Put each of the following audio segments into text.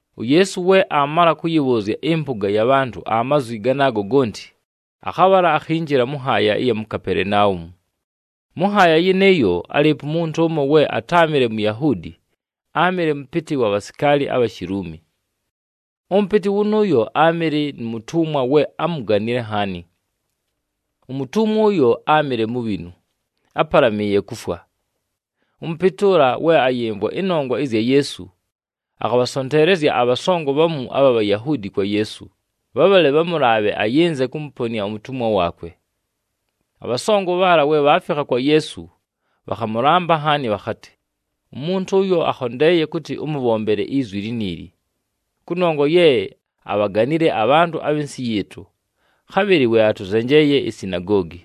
UYeesu we aamala kʉyɨbhʉʉzya ɨmpʉga ya bhantʉ amazwi ganaago gonti, akhabhala mʉ nhaaya ɨya mu Kapelenaumu. Mʉ nhaaya yɨnɨɨyo, álɨɨpo umuntu ʉmo we atáamɨle Muyahuudi, áamɨle mʉpɨtɨ wa bhasikaali abha Shiluumi. Ʉmʉpɨtɨ wʉnʉʉyo áamɨle nu mutumwa we ámuganile nhaani. Umutumwa ʉyo áamɨle mubhinu, ápalamɨɨye kufwa. Ʉmʉpɨtɨ ʉla, we ayɨmvwa ɨnongwa ɨzya Yeesu, akhabhasonteelezya abhasongo bhamu abha Bhayahuudi kwa Yeesu, bhabhale bhamʉlaabhe ayɨnze kʉmʉponɨa umutumwa waakwe. Abhasongo bhaala, we bhaafikha kwa Yeesu, bhakhamʉlamba nhaani bhakhatɨ, “Umuntu ʉyo akhondeeye kʉtɨ ʉmʉbhombele izwi liniili, kʉnongwa ye abhaganile abhantʉ abhɨ nsɨ yɨɨtʉ, khabhɨlɨ we atʉzenjeeye isinagoogi.”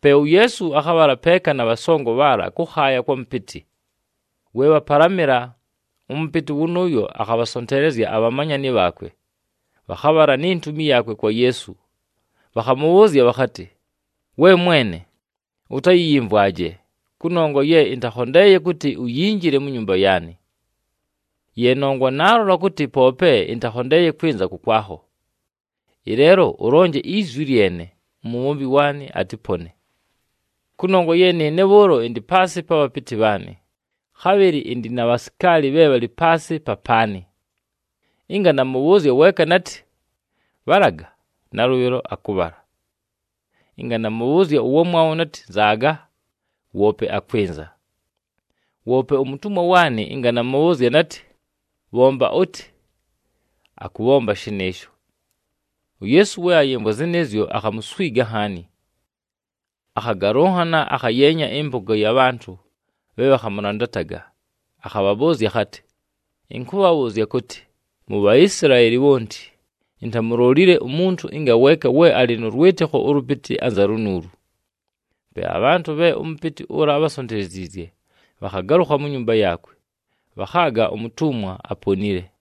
Pe uYeesu akhabhala peeka na bhasongo bhaala kʉkhaaya kwa mʉpɨtɨ. We bhapalamɨla, ʉmʉpɨtɨ wʉnʉʉyo akhabhasonteelezya abhamanyani bhaakwe, bhakhabhala ni ntumi yaakwe kwa Yeesu, bhakhamʉbhʉʉzya bhakhatɨ, “We Mwene, ʉtayɨyɨmvwaje, kʉnongwa ye ɨntakhondeeye kʉtɨ uyinjile mu nyumba yaanɨ. Ye nongwa naalola kʉtɨ poope ɨntakhondeeye kwɨnza kʉkwakho. Ɨleelo ʉlonje izwi lyene, umubhombi waanɨ atɨpone. Kʉnongwa ye nɨɨne bhʉʉlo ɨndɨ paasɨ pa bhapɨtɨ bhaanɨ. Khabhɨlɨ ɨndɨ na bhasikaali bhe bhalɨ paasɨ papaanɨ. Ɨnga namʉbhʉʉzya weeka natɨ, ‘Bhalaga!’, nalʉbhɨlo akʉbhala. Ɨnga namʉbhʉʉzya ʉwamwabho natɨ, ‘Nzaaga!’, woope akwɨnza. Woope umutumwa waanɨ, ɨnga namʉbhʉʉzya natɨ, ‘Bhomba ʉtɨ!’, akʉbhomba shɨnɨɨsho.” UYeesu we ayɨmvwa zɨnɨɨzyo, akhamuswiga nhaani. Akhagalʉnhana akhayeenya ɨmpʉga ya bhantʉ bhe bhakhamʉlandataga, akhabhabhʉʉzya akhatɨ, “Ɨnkʉbhabhʉʉzya kʉtɨ, mu Bhaisilaeli bhonti, intamulolile umuntu ngaweeka we alɨ nʉ lwɨtɨkho ʉlʉpɨtɨ anza lunuulu!” Pe abhantʉ bhe ʉmʉpɨtɨ ʉla ábhasonteleziizye bhakhagalʉkha mu nyumba yaakwe, bhakhaaga umutumwa aponile.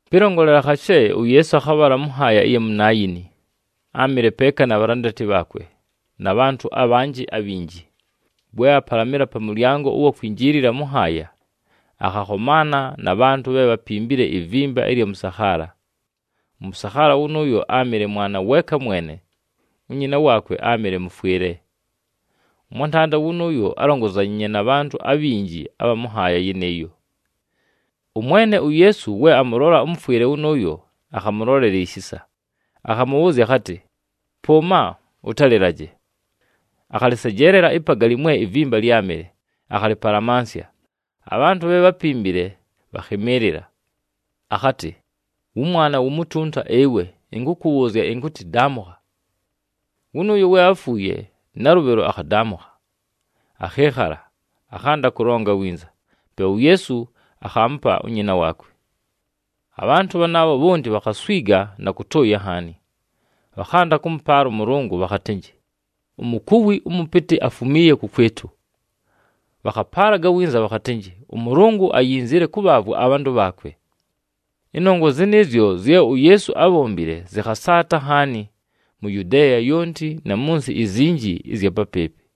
Pɨlongolela khashe, uYeesu akhabhala mʉ nhaaya ɨya mu Naayini, áamɨle peeka na bhalandati bhaakwe, na bhantʉ abhanjɨ abhinji. We apalamɨla pa mʉlyango ʉwa kwinjiilila mʉ nhaaya, akhakhomaana na bhantʉ bhe bhapimbile ivimba ɨlya mʉsakhaala. Ʉmʉsakhaala wʉnʉʉyo áamɨle mwana weeka mwene, unyina waakwe áamɨle mʉfwɨle. Ʉmwantanda wʉnʉʉyo álongozanyiinye na bhantʉ abhinji abha mʉ nhaaya yɨnɨɨyo. ɄMwene uYeesu we amʉlola ʉmʉfwɨle wʉnʉʉyo, akhamʉlolela ishisa, akhamʉbhʉʉzya akhatɨ, “Pʉʉma, ʉtalɨlaje.” Akhalɨsejeelela ipagali mwe ivimba lyámɨle, akhalɨpalamansya. Abhantʉ bhe bhápimbile, bhakhɨmɨɨlɨla. Akhatɨ, “Wʉmwana wumutunta ɨwe, ɨnkʉkʉbhʉʉzya ɨnkʉtɨ, daamʉkha!” Wʉnʉʉyo we áfuuye, nalʉbhɨlo akhadaamʉkha, akhɨɨkhala, akhanda kʉlonga winza. Pe uYeesu akhaamupa unyina waakwe. Abhantʉ bhanaabho bhonti bhakhaswiga na kʉtʉʉya nhaani! Bhakhanda kʉmʉpaala ʉMʉlʉngʉ, bhakhatɨnjɨ, “Umukuwi ʉmʉpɨtɨ afumiiye kʉkwɨtʉ!” Bhakhapaalaga winza bhakhatɨnjɨ, “ɄMʉlʉngʉ ayinzile kʉbhaavwa abhantʉ bhaakwe!” Ɨnongwa zɨnɨɨzyo zye uYeesu ábhombile zɨkhasaata nhaani mu Yudeeya yonti, na mʉ nsɨ izinji ɨzya papɨɨpɨ.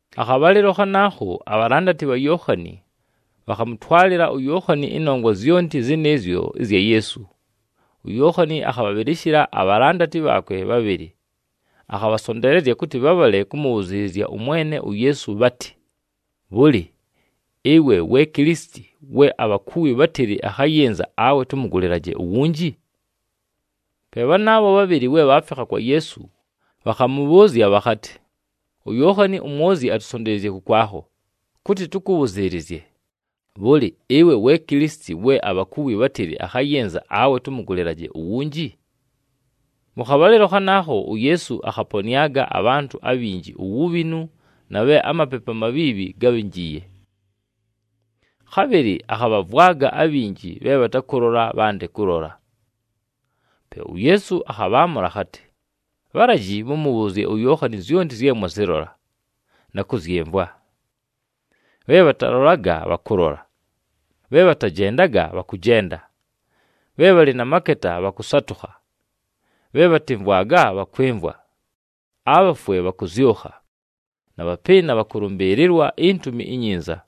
Akhabhalɨlo khanaakho, abhalandati bha Yookhani, bhakhamʉtwalɨla uYookhani ɨnongwa zyonti zɨnɨɨzyo ɨzya Yeesu. UYookhani akhabhabhɨlɨshɨla abhalandati bhaakwe bhabhɨlɨ, akhabhasonteelezya kʉtɨ bhabhale kʉmʉbhʉzɨɨlɨzya ʉMwene uYeesu, bhatɨ, “Bhʉlɨ, ɨwe we Kilisiti we abhakuwi bhátɨlɨ akhayɨnza, awe tʉmʉgʉlɨlaje uwunji?” Pe bhanaabho bhabhɨlɨ we bhaafikha kwa Yeesu, bhakhamʉbhʉʉzya bhakhatɨ, “UYookhani uMwozyi atusonteleziizye kʉkwakho, kʉtɨ tʉkʉbhʉzɨɨlɨzye, ‘Bhʉlɨ, ɨwe we Kilisiti we abhakuwi bhátɨlɨ akhayɨnza, awe tʉmʉgʉlɨlaje uwunji?’” Mʉ khabhalɨlo khanaakho, uYeesu akhaponɨaga abhantʉ abhinji uwubhinu na bhe amapepu amabhiibhi gábhinjiiye. Khabhɨlɨ akhabhavwaga abhinji bhe bhatakʉlola bhande kʉlola. Pe uYeesu akhabhaamʉla akhatɨ, “Bhalaji mʉmʉbhʉʉzye uYookhani zyonti zye mwazɨlola, na kʉzyɨmvwa: bhe bhatalolaga bhakʉlola, bhe bhatajendaga bhakʉjenda, bhe bhalɨ na maketa bhakʉsatʉkha, bhe bhatɨmvwaga bhakwɨmvwa, abhafwe bhakʉzyʉkha, na bhapɨɨna bhakʉlʉmbɨɨlɨlwa iNtumi iNyinza.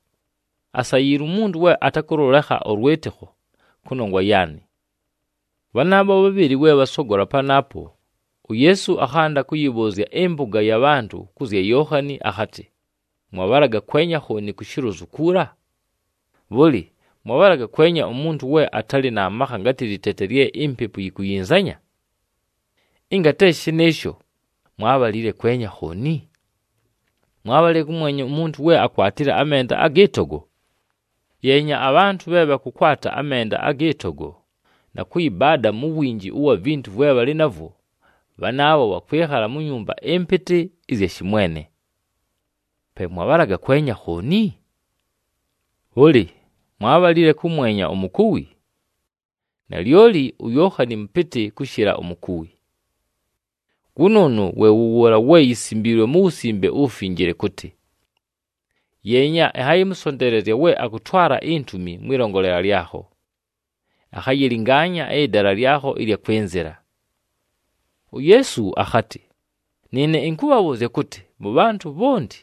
Asayiilwe umuntu we atakʉlʉlekha ʉlwɨtɨkho kʉnongwa yaanɨ!” Bhanaabho bhabhɨlɨ we bhasogola panaapo, uYeesu akhanda kʉyɨbhʉʉzya ɨmpʉga ya bhantʉ kʉ zya Yookhani akhatɨ, “Mwabhalaga kwenya khooni ku shilozu kuula? Bhʉlɨ, mwabhalaga kwenya umuntu we atalɨ na makha ngatɨ lɨtete lye impepu yikuyinzanya? Ɨnga te shɨ shɨnɨɨsho, mwábhalile kwenya khooni? Mwábhalile kʉmwenya umuntu we akwatile amenda agɨ togo? Yeenya, abhantʉ bhe bhakʉkwata amenda agɨ togo, na kʉyɨbaada mu winji ʉwa vintu vwe bhalɨ navwo, bhanaabho bhakwɨkhala mu nyumba ɨmpɨtɨ ɨzya shɨmwene! Pe mwabhalaga kwenya khooni? Bhʉlɨ, mwábhalile kʉmwenya umukuwi? Nalyoli uYookhani mʉpɨtɨ kʉshɨla umukuwi. Wʉnʉʉnʉ we wʉ wʉʉla we yisimbiilwe mu Wusimbe uWufinjile kʉtɨ, ‘Yeenya, ɨnhayɨmʉsonteelezya we akʉtwala intumi mwɨlongolela lyakho, akhayɨlɨngaanya ɨdala lyakho ɨlya kwɨnzɨla.’” UYeesu akhatɨ, “Nɨɨne ɨnkʉbhabhʉʉzya kʉtɨ, mʉ bhantʉ bhonti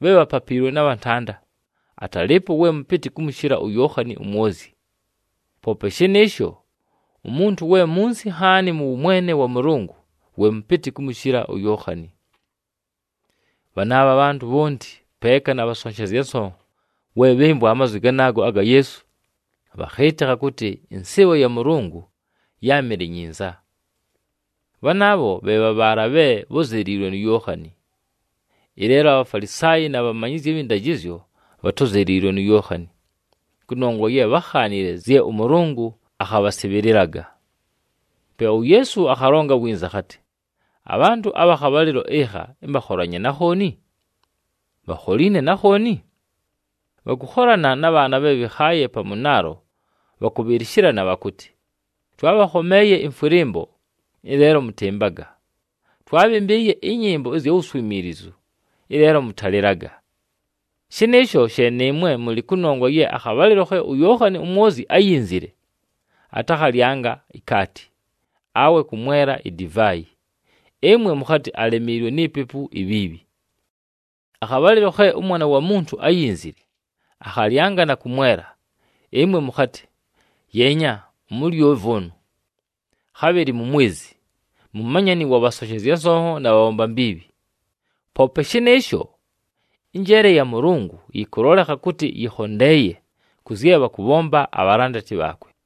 bhe bhapapiilwe na bhantanda, atalɨɨpo we mʉpɨtɨ kʉmʉshɨla uYookhani uMwozyi. Poope shɨnɨɨsho, umuntu we munsi nhaani mʉ wʉmwene wa Mʉlʉngʉ, we mʉpɨtɨ kʉmʉshɨla uYookhani.” Bhanaabho abhantʉ bhonti, peeka na bhasonshezya nsonho, we bhɨmvwa amazwi ganaago aga Yeesu, bhakhɨɨtɨkha kʉtɨ ɨnsɨɨbho ya Mʉlʉngʉ yáamɨle nyinza. Bhanaabho bhe bha bhaala bhe bhózeliilwe nu Yookhani. Ɨleelo aBhafalisaayi na bhamanyizyi abhɨ ndajɨzyo bhatózeliilwe nu Yookhani, kʉnongwa ye bhákhaanile zye ʉMʉlʉngʉ akhabhasɨbhɨlɨlaga. Pe uYeesu akhalonga winza akhatɨ, “Abhantʉ abha khabhalɨlo ɨkha ɨmbakholanye na khooni? Bhakholiine na khooni? Bhakʉkholana na bhaana bhe bhɨkhaaye pa mʉnaalo, bhakʉbhɨlɨshɨlana bhakʉtɨ, ‘Twaabhakhomeeye ɨmfwɨlɨmbo, ɨleelo mʉtɨmbaga! Twaabhɨmbɨɨye ɨnyɨmbo ɨzya wuswimiilizu, ɨleelo mʉtalɨlaga!’ Shɨnɨɨsho she nɨɨmwe mʉlɨ, kʉnongwa ye akhabhalɨlo khe uYookhani uMwozyi áyinzile, atakhalyanga ikaati, awe kʉmwela idivaayi, ɨmwe mʉkhatɨ, ‘Alemiilwe ni pepu ibhiibhi!’ Akhabhalɨlo khe ʉMwana wa Muntu áyinzile, akhalyanga na kʉmwela. Ɨmwe mʉkhatɨ, ‘Yeenya! Umulyovi ʉnʉ, khabhɨlɨ mumwezi, mumanyani wa bhasonshezya nsonho na bhabhomba mbiibhi!’ Poope shɨnɨɨsho, ɨnjeele ya Mʉlʉngʉ, yɨkʉlolekha kʉtɨ yɨkhondeeye kʉ zye bhakʉbhomba abhalandati bhaakwe.”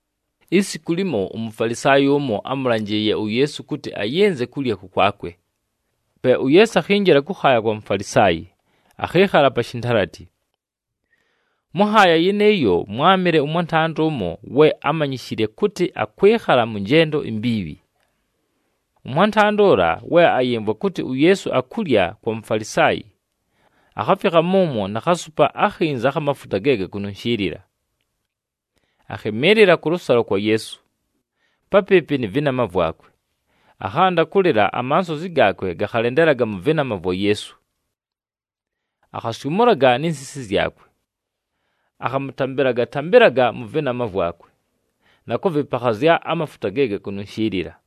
Isiku limo, uMufalisaayi ʉmo ámʉlanjɨɨye uYeesu kʉtɨ ayɨnze kulya kʉkwakwe. Pe uYeesu akhinjila kʉkhaaya kwa Mufalisaayi, akhɨɨkhala pa shintalati. Mʉ nhaaya yɨnɨɨyo, mwámɨle nʉ mwantanda ʉmo we ámanyishile kʉtɨ akwɨkhala mʉ njendo imbiibhi. Ʉmwantanda ʉla, we ayɨmvwa kʉtɨ uYeesu akulya kwa Mufalisaayi, akhafikha mʉmwo na khasupa akhinza akha mafuta ge gakununshiilila. Akhɨmɨɨlɨla kʉlʉsalo kwa Yeesu, papɨɨpɨ nɨ vɨnama vwakwe. Akhanda kʉlɨla, amansozi gaakwe gakhalendelaga mʉ vɨnama vwa Yeesu. Akhasyʉmʉlaga ni nsisi zyakwe, akhamʉtambɨlaga-tambɨlaga mʉ vɨnama vwakwe, na kʉvɨpakhazya amafuta ge gakununshiilila.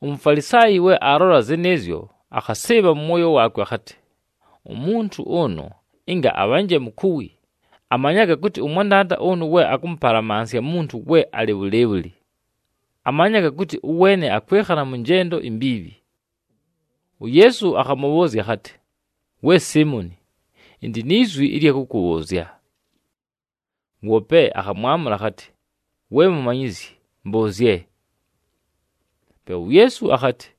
UMufalisaayi we aalola zɨnɨɨzyo, akhasɨɨbha mʉ mwoyo waakwe akhatɨ, “Umuntu ʉnʉ, ɨnga abhanje mukuwi, amanyaga kʉtɨ ʉmwantanda ʉnʉ we akʉmʉpalamansya muntu we alɨ bhʉlɨɨbhʉlɨ. Amanyaga kʉtɨ ʉweene akwɨkhala mʉ njendo imbiibhi!” UYeesu akhamʉbhʉʉzya akhatɨ, “We Siimoni, ɨndɨ ni zwi ɨlya kʉkʉbhʉʉzya.” Woope akhamwamʉla akhatɨ, “We Mumanyizyi, mbʉʉzye.” Pe uYeesu akhatɨ,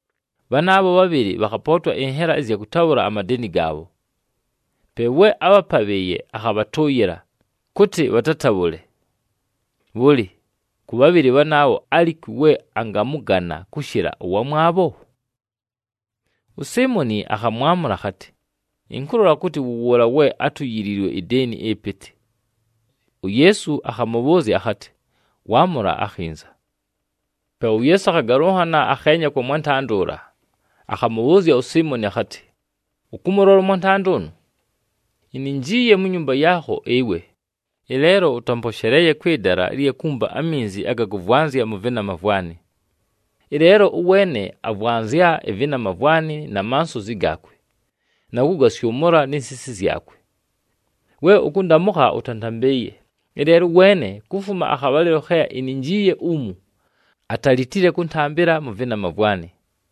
Bhanaabho bhabhɨlɨ bhakhapootwa ɨnhela ɨzya kʉtabhʉla amadeeni gaabho, pe we ábhapabhɨɨye akhabhatʉʉyɨla, kʉtɨ bhatatabhʉle. Bhʉlɨ, kʉ bhabhɨlɨ bhanaabho, alikwi we angamʉgana kʉshɨla ʉwamwabho?” USiimoni akhamwamʉla akhatɨ, “Ɨnkʉlola kʉtɨ wʉ wʉʉla we átuyiliilwe ideeni ɨpɨtɨ.” UYeesu akhamʉbhʉʉzya akhatɨ, “Waamʉla akhinza.” Pe uYeesu akhagalʉnhana, akheenya kwa mwantanda ʉla, akhamʉbhʉʉzya uSiimoni akhatɨ, “Ʉkʉmʉlola ʉmwantanda ʉnʉ? Ininjiiye mu nyumba yaakho ɨwe, ɨleelo ʉtamposheleeye kwɨ dala ɨlya kumpa aminzi aga kʉvwanzya mʉ vɨnama vwanɨ. Ɨleelo ʉweene avwanzya ɨvɨnama vwanɨ na mansozi gaakwe, na kʉgasyʉmʉla ni nsisi zyakwe. We ʉkʉndamʉkha, ʉtantambɨɨye, ɨleelo ʉweene, kufuma akhabhalɨlo khe ininjiiye umu, atalitile kʉntambɨla mʉ vɨnama vwanɨ.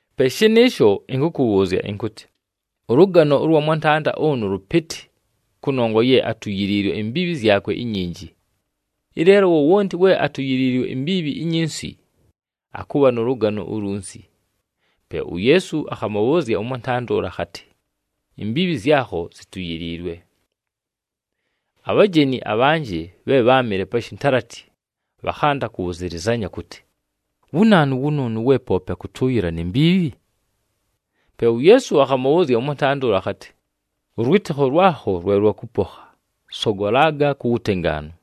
Pe shɨnɨɨsho, ɨnkʉkʉbhʉʉzya ɨnkʉtɨ, ʉlʉgano ʉlwa mwantanda ʉnʉ lʉpɨtɨ, kʉnongwa ye atuyiliilwe imbiibhi zyakwe inyinji. Ɨleelo wowonti we atuyiliilwe imbiibhi inyinsi, akʉbha nʉ lʉgano ulunsi.” Pe uYeesu akhamʉbhʉʉzya ʉmwantanda ʉla akhatɨ, “Imbiibhi zyakho zituyiliilwe.” Abhajeni abhanjɨ bhe bháamɨle pa shintalati, bhakhanda kʉbhʉzɨlɨzanya kʉtɨ, “Wu naanu wʉnʉʉnʉ, we poope akʉtʉʉyɨla ni mbiibhi?” Pe uYeesu akhamʉbhʉʉzya ʉmwantanda ʉla akhatɨ, “Ʉlwɨtɨkho lwakho lwe lwakʉpokha, sogolaga ku wutengaanu.”